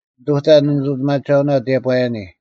ᓂᑐᑕ ᓂᓂᑐᑎᒪᒐᐅᓐ ᑎᔭᑈᔭᓂ;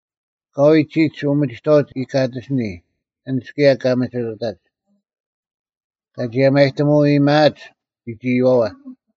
ᐊᑲᐎᔭ ᒋᒡ ᐅᒥᒋᑥᐅᒡ ᐃᑲᑎᓯᓂ, ᐊᓐᒡ ᑭᔭ ᑲ ᒥᒋᑐᑕᒡ, ᑲ ᒋᔭᒪᔨᑎᒧᐅ ᐃᔨᒪᐊᒡ ᐎᒡ ᐃᔪᐛᐛ,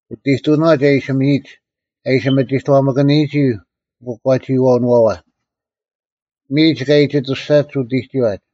ᐅᑦ ᐃᑐᓄᐛᒡ ᐃᓯ ᒥᔨᒡ, ᑭᔭ ᐊ ᐃᓯ ᒥᒋᑥᒪᑭᓂᔨᒋ ᐅᑯᒂᒋᐃᐛᐅᓄᐛᐛ: ᒥᔨᒡ ᑲ ᐃᑎᑐᔅᒐᒡ ᐅᑎᒋᐛᒡ: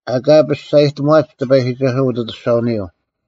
ᐊᑲ ᐊ ᐱᔅᒐᔨᑎᒺᒡ ᑎᐸᔨᒋᒐᓱᐛ ᐅᑦ ᐊᑐᔅᒐᐅᓂᔪᐤ,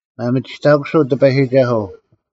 ᒪᒥᒋᑕᑯᓱᐤ ᑎᐸᔨᒋᒐᓱᐤ,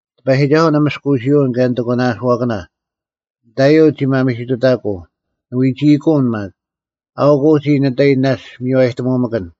ᑎᐸᔨᒋᒐᓱᐤ ᓂᒥᔅᑯᐅᓯᐅᓐ ᑭᔭ ᓂᑦ ᐊᒂᓇᐅᓱᐛᑭᓇ; ᓂᑕᐃᔪᐤ ᒋ ᒪᒥᓯᑐᑕᑯᐤ, ᓂ ᐎᒋᐃᑯᐅᓐ ᒪᒃ: ᐊᐅᒄ ᐅᒋ ᓂᑕᐃ ᓇᔅᒡ ᒪᔽᔨᑎᒧᒪᑭᓐ;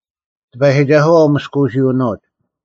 ᑎᐸᔨᒋᒐᓱᐛ ᐅᒥᔅᑯᐅᓯᐅᓄᐅᒡ,